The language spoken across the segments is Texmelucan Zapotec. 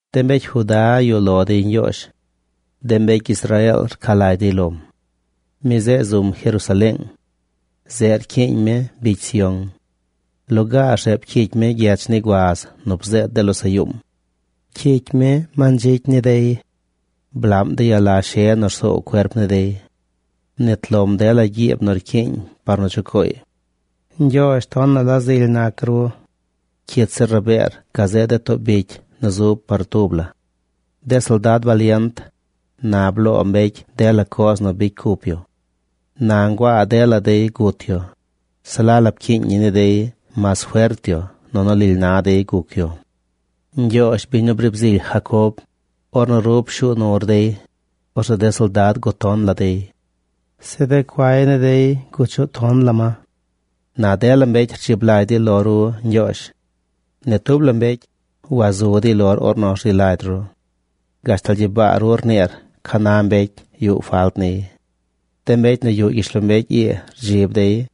De mbecy Juda yuꞌ lo dey Ñgyoozh. De mbecy Israeel rca lagy dey lom. Mi zeꞌ zum Jerusaleeng. Zeꞌ rcyiiñ mi bicy Sión. Lugaar zeꞌ pcyicy mi gyech ni guaz nu bzeed de losaꞌ yuum. Pcyicy mi mandzicy ni dey. Blaꞌm de yala she nu rsoow cuerp ni dey. Mnit lom dela gyib nu rcyiiñ par nu chucooy. Ñgyoozh, tonaꞌ la zily nac ru. Cyit zir rabeer gazeꞌ de too bicy nu zub par tub la. De soldad balient, na bloo mbecy dela coz nu bicy cup yu. Na nguaa dela dey gut yu. Se la la pcyiiñ ñi ni dey mas fert yu nunu lily na dey guc yu. Ñgyoozh, biñ nu briib zily Jacob, ornu ru pshuu nur dey, orzeꞌ de soldad guton la dey. Zeꞌ de cuay ni dey guchuꞌ ton la ma. Na dela mbecy rdzib lagy dey lo ru, Ñgyoozh. Ni tub la mbecy wazu dey lor ornu rzi lagy ru. Gashtal gyibaa ru rniir ca na mbecy yuꞌ falt niy. De mbecy nu yuꞌ gyishlombecy ii rdzib dey.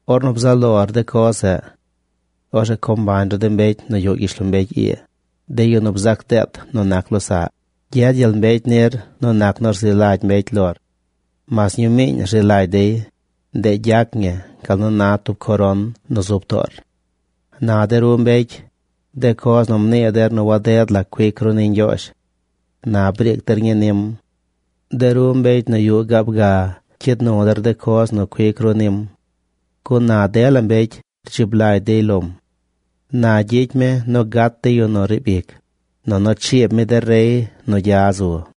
ornu bzaꞌ lor de coz zeꞌ. Orzeꞌ co mbañ ru de mbecy nu yuꞌ gyishlombecy ii, de yu nu bzac deet nu nac losaꞌy. Gyed gyel mbecy nir nu nac nu rzi lagy mbecy lor. Mas ñumiiñ rzi lagy dey, ndeꞌ gyac ñi gal nu na tub coron nu zub toor. Na de ru mbecy, de coz nu mnii der nu waded la la cuic ru ni Ñgyoozh, na briic der ñii nim. De ru mbecy nu yuꞌ gaab ga cyid nu der coz nu cuic ru nim. Gun na dela mbecy rdzib lagy dey lom. Na gyicy mi nu gat de yu nu riib ic, nunu chiib mi de rey nu gya zu.